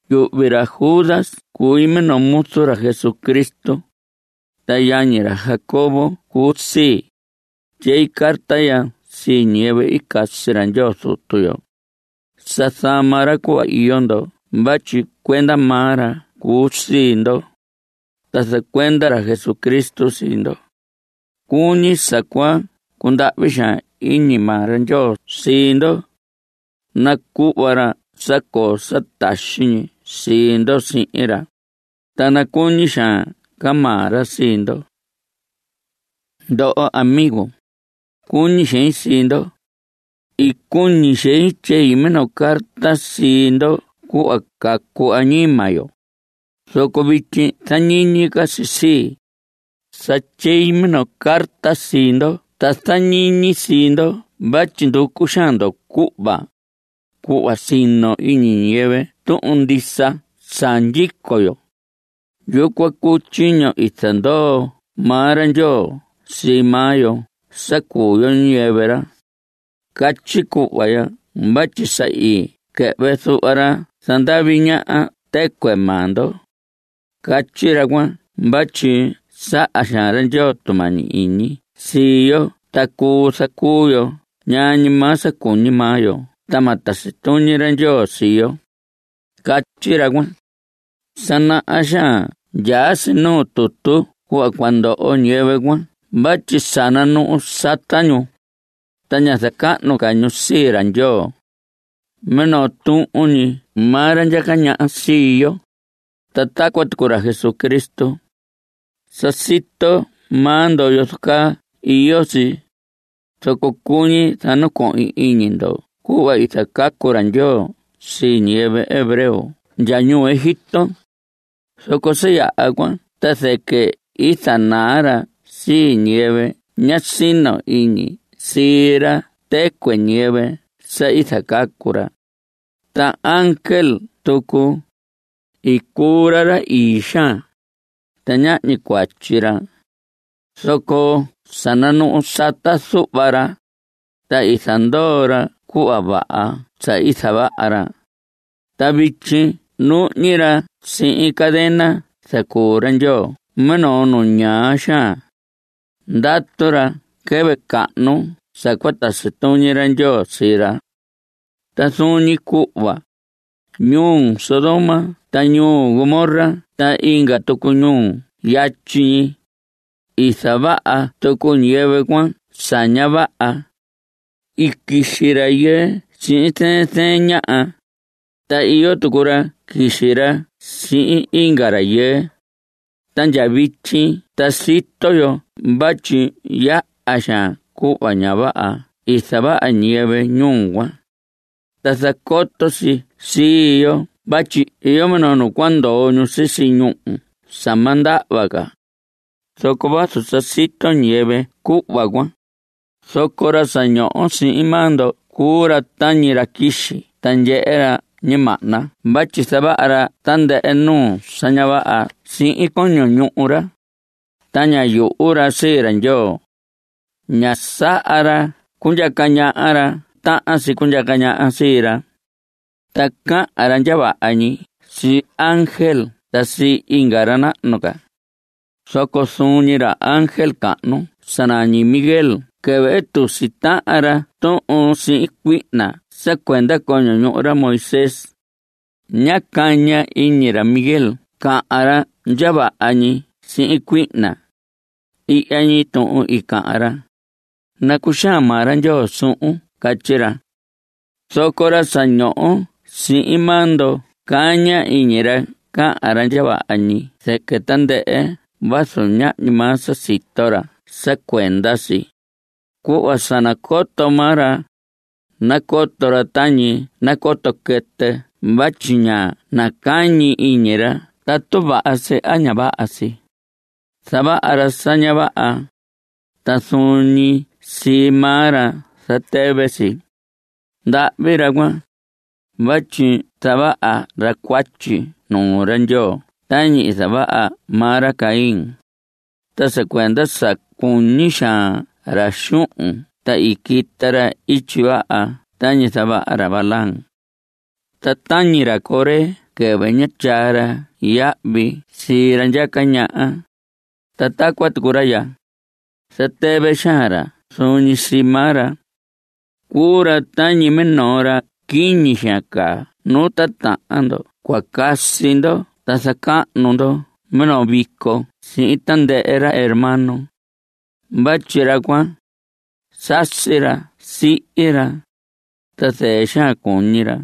Yuhvi ra Judas cui minoo muzu ra Jesucristo. Ta yañi ra Jacobo cuu sii. Tyei carta ya sii ñiyɨvɨ i casi ra Ndyoo Zutu yo. Sa zama ra cuhva iyo ndo vatyi cuenda maa ra cuu sii ndo. Ta zacuenda ra Jesucristo sii ndo. Cuñi sa cua cundahvi xaan iñi maa ra Ndyoo sii ndo. Nacuhva ra sa coo sa taxi ñi sii ndo sihin ra, ta nacuñi xaan ca maa ra sii ndo. Ndoho amigo, cuñi xein sii ndo. I cuñi xein tyei minoo carta sii ndo cuhva cacu añima yo. Zoco vityi zañiñi ca si sii, sa tyei minoo carta sii ndo ta zañiñi sii ndo vatyi nducu xaan ndo cuhva, cuhva sino iñi ñiyɨvɨ tuhun ndisa sa ndyico yo. Yucuan cuu tyiño i zandoo maa ra Ndyoo sii maa yo sa cuu yo ñiyɨvɨ ra. Catyi cuhva ya vatyi sa i quɨhvɨ zuhva ra zandavi ñaha tɨcuɨ maa ndo. Catyi ra cuan vatyi saha xaan ra Ndyoo tumañi iñi sii yo ta cuu zacuu yo ñaa ñi maa sa cuñi maa yo ta ma tasi tuñi ra Ndyoo sii yo, catyi ra cuan. Sa naha xaan ndyaa si nuu tutu cuhva cua ndoho ñiyɨvɨ cuan vatyi sa nanuhu sata ñu, ta ña zacahnu ca ñu sii ra Ndyoo. Minoo tuhun ñi maa ra ndyaca ñaha sii yo, ta tacuan tucu ra Jesucristo. Sa sito maa ndo yozo caa iyo si, zoco cuñi zanacohin iñi ndo cuhva i zacacu ra Ndyoo sii ñiyɨvɨ hebreo ndya ñuu Egipto, zoco sa yaha cuan ta zɨquɨ i zanaa ra sii ñiyɨvɨ ñá sino iñi sii ra tɨcuɨ ñiyɨvɨ sa i zacacu ra. Ta ángel tucu, i cuu ra ra ii xaan, ta ñahñi cuatyi ra. Zoco sa nanuhu sata zuhva ra, ta i zandoo ra cuhva vaha sa i zavaha ra. Ta vityi nuhñi ra sihin cadena zacuu ra Ndyoo minoo nu ñaa xaan. Ndatu ra quɨvɨ cahnu sa cua tasi tuñi ra Ndyoo sii ra. Ta zuun ñi cuhva, ñuu Sodoma ta ñuu Gomorra ta inga tucu ñuu yatyi ñi, i zavaha tucu ñiyɨvɨ cuan sa ña vaha. I quixi rayɨɨ sihin zɨɨn zɨɨn ñaha. Ta iyo tucu ra quixi ra sihin inga rayɨɨ. Ta ndya vityi ta sito yo vatyi yaha xaan cuhva ña vaha i zavaha ñiyɨvɨ ñuu cuan. Ta zacoto si sii yo vatyi iyo minoo nu cua ndoho ñu sisi ñúhu sa ma ndahva ca. Zoco vazu sa sito ñiyɨvɨ cuhva cuan, zoco ra sa ñoho sihin maa ndo cuu ra tañi ra quixi ta ndyehe ra ñimahna vatyi zavaha ra tandɨhɨ nuu sa ña vaha sihin coño ñuhu ra, ta ña yuhu ra sii ra Ndyoo. Ña saha ra cundyaca ñaha ra tahan si cundyaca ñaha sii ra. Ta cahan ra ndya vaha ñi sii ángel ta sii inga ra nahnu ca. Zoco zuun ñi ra ángel cahnu sa nañi Miguel quɨvɨ i tusi tahan ra tuhun sihin cuihna sa cuenda coño ñuhu ra Moisés, ñá caña iñi ra Miguel cahan ra ndya vaha ñi sihin cuihna. Ihya ñi tuhun i cahan ra: “Nacuxaan maa ra Ndyoo suhun.” Catyi ra. Zoco ra sa ñoho sihin maa ndo caña iñi ra cahan ra ndya vaha ñi zɨquɨ tandɨhɨ vazu ñahñi maa sa sito ra sa cuenda si. Cuhva sa nacoto maa ra, nacoto ra tañi nacoto quɨtɨ vatyi ña nacañi iñi ra tatu vaha si a ña vaha si. Zavaha ra sa ña vaha, ta zuun ñi sii maa ra zatɨvɨ si. ¡Ndahvi ra cuan! vatyi zavaha ra cuatyi nuu ra Ndyoo tañi i zavaha maa ra Caín. Ta sa cuenda sa cuñi xaan ra xuhun ta i quita ra ityi vaha tañi zavaha ra Balaam. Ta tañi ra Coré quɨvɨ ñá tyaa ra yahvi sii ra ndyaca ñaha, ta tacuan tucu ra ya, zatɨvɨ xaan ra zuun ñi sii maa ra. Cuu ra tañi minoo ra quiñi xaan caa nu titahan ndo cua casi ndo ta zacahnu ndo minoo vico sihin tandɨhɨ ra hermano. Vatyi ra cuan, sasi ra, sihi ra, ta zɨɨ xaan cuñi ra.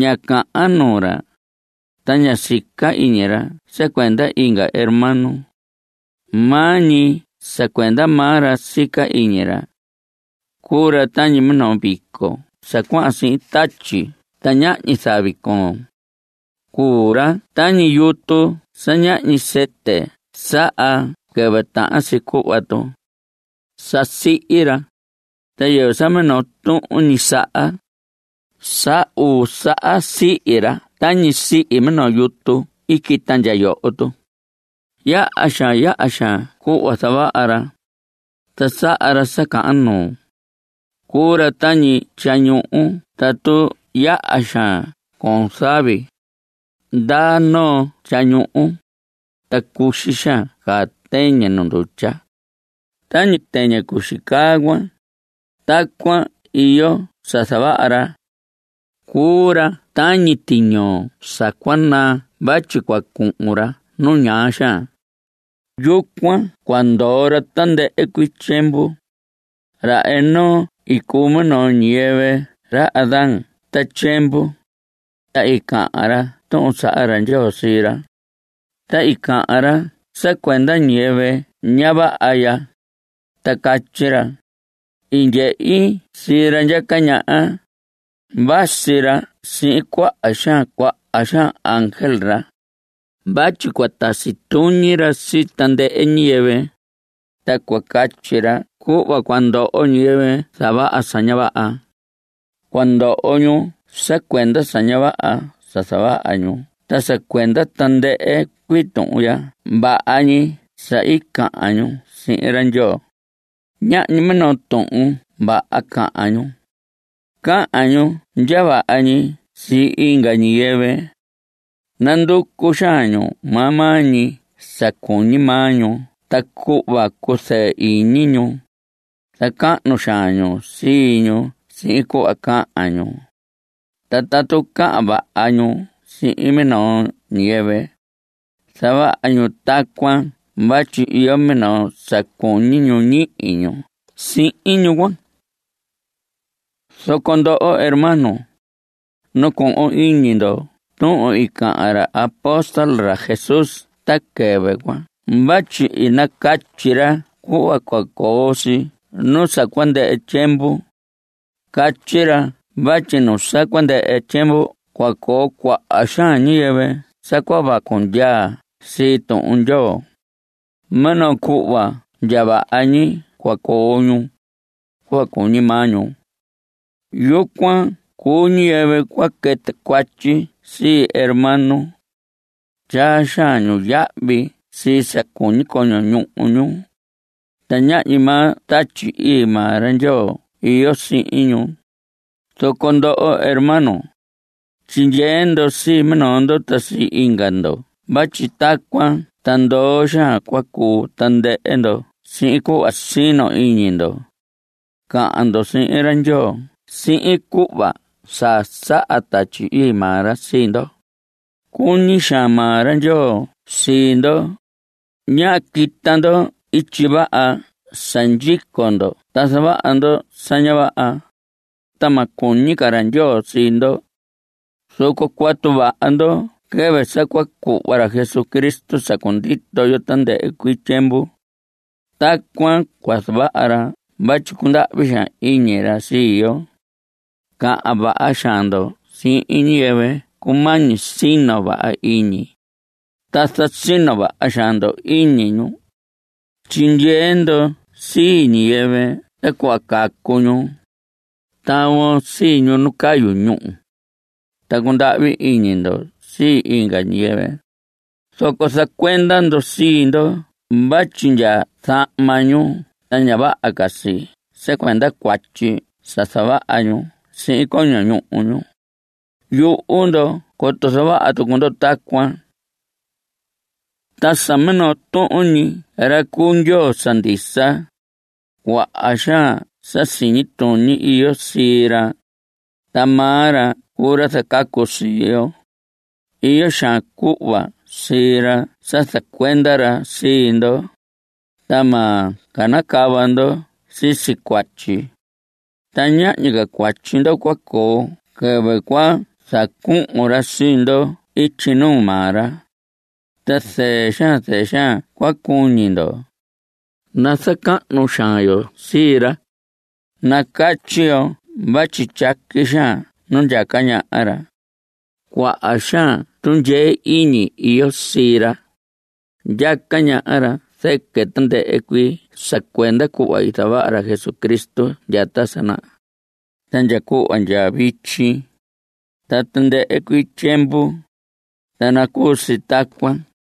Ña cahan nuu ra, ta ña sica iñi ra sa cuenda inga hermano. Maa ñi sa cuenda maa ra sica iñi ra. Cuu ra tañi minoo vico sa cuahan sihin tatyi ta ñahñi zavi coon. Cuu ra tañi yutu sa ñahñi sɨtɨ saha quɨvɨ tahan si cuhva tu. Sa sihi ra, ta yɨvɨ sa minoo tuhun ñi saha. Sa uu saha sihi ra tañi sihi minoo yutu i quita ndya yoho. Yaha xaan, yaha xaan cuhva zavaha ra, ta saha ra sa cahan nuu. Cuu ra tañi tyañuhu tatu yaha xaan coon zavi. Ndaa noo tyañuhu, ta cuxi xaan caa tɨñɨ nuu ndutya. Tañi tɨñɨ cuxi caa cuan, tacuan iyo sa zavaha ra. Cuu ra tañi tiñoo sa cua naa vatyi cua cuhun ra nu ñaa xaan. Yucuan cua ndoo ra tandɨhɨ cuii tyiemvu. Ra Enoc i cuu minoo ñiyɨvɨ ra Adán ta tyiemvu, ta i cahan ra Tuhun i saha ra Ndyoo sii ra. Ta i cahan ra sa cuenda ñiyɨvɨ ña vaha ya, ta catyi ra: “I ndyehi sii ra ndyaca ñaha. Vasi ra sihin cuaha xaan cuaha xaan ángel ra vatyi cua tasi tuñi ra sii tandɨhɨ ñiyɨvɨ, ta cua catyi ra cuhva cua ndoho ñiyɨvɨ zavaha sa ña vaha. Cua ndoho ñu sa cuenda sa ña vaha sa zavaha ñu ta sa cuenda tandɨhɨ cuii tuhun ndya vaha ñi sa i cahan ñu sii ra Ndyoo.” Ñahñi minoo tuhun vaha cahan ñu. Cahan ñu ndya vaha ñi sii inga ñiyɨvɨ. Nanducu xaan ñu maa maa ñi sa cuñi maa ñu ta cuhva cuzɨɨ iñi ñu. Zacahnu xaan ñu sii ñu sihin cuhva cahan ñu. Ta tatu cahan vaha ñu sihin minoo ñiyɨvɨ, zavaha ñu tacuan vatyi iyo minoo sa cuñi ñu ñihi ñu sihin ñu cuan. Zoco ndoho hermanos, nacohon iñi ndo tuhun i cahan ra apóstol ra Jesús ta quɨvɨ cuan vatyi i nacatyi ra cuhva cua coo si nu sa cua ndɨhɨ tyiemvu. Catyi ra vatyi nu sa cua ndɨhɨ tyiemvu cua coo cuaha xaan ñiyɨvɨ sa cua vacu ndyaa sii Tuhun Ndyoo. Minoo cuhva ndya vaha ñi cua coo ñu, cuhva cuñi maa ñu. Yucuan cuu ñiyɨvɨ cua quɨtɨ cuatyi sii hermano. Tyaa xaan ñu yahvi sii sa cuñi coño ñuhu ñu. Ta ñahñi maa Tatyi Ii maa ra Ndyoo iyo sihin ñu. Zoco ndoho hermanos, tyindyee ndo sii minoo ndo ta sii inga ndo vatyi tacuan ta ndoo xaan cua cuu tandɨhɨ ndo sihin cuhva sino iñi ndo. Cahan ndo sihin ra Ndyoo sihin cuhva sa saha Tatyi Ii maa ra sii ndo. Cuñi xaan maa ra Ndyoo sii ndo. Ñáha quita ndo ityi vaha sa ndyico ndo ta zavaha ndo sa ña vaha, ta ma cuñi ca ra Ndyoo sii ndo. Zoco cuatu vaha ndo quɨvɨ sa cua cuhva ra Jesucristo sa cundito yo tandɨhɨ cuii tyiemvu. Tacuan cua zavaha ra vatyi cundahvi xaan iñi ra sii yo. Cahan vaha xaan ndo sihin ñiyɨvɨ cumañi sino vaha iñi, ta zasino vaha xaan ndo iñi ñu. Tyindyee ndo sii ñiyɨvɨ ta cuhva cacu ñu. Tavon sii ñu nu cayu ñúhu. Ta cundahvi iñi ndo sii inga ñiyɨvɨ, zoco zacuenda ndo sii ndo vatyi ndya zahma ñu ta ña vaha si sa cuenda cuatyi sa zavaha ñu sihin coño ñuhu ñu. Yuhu ndo coto zavaha tucu ndo tacuan. Ta sa minoo tuhun ñi ra cuu Ndyoo sa ndisa, cuaha xaan sa siñi tuñi iyo sii ra. Ta maa ra cuu ra zacacu sii yo. Iyo xaan cuhva sii ra sa zacuenda ra sii ndo, ta ma canacava ndo sisi cuatyi. Ta ñahñi ca cuatyi ndo cua coo quɨvɨ cua zacuhun ra sii ndo ityi nuu maa ra, ta zɨɨ xaan zɨɨ xaan cua cuñi ndo. Nazacahnu xaan yo sii ra. Nacatyi yo vatyi tyaqui xaan nu ndyaca ñaha ra. Cuaha xaan tundyee iñi iyo sii ra. Ndyaca ñaha ra zɨquɨ tandɨhɨ cuii sa cuenda cuhva i zavaha ra Jesucristo ndya ta sa naha, ta ndya cuhva ndya vityi, ta tandɨhɨ cuii tyiemvu. Ta nacuu si tacuan.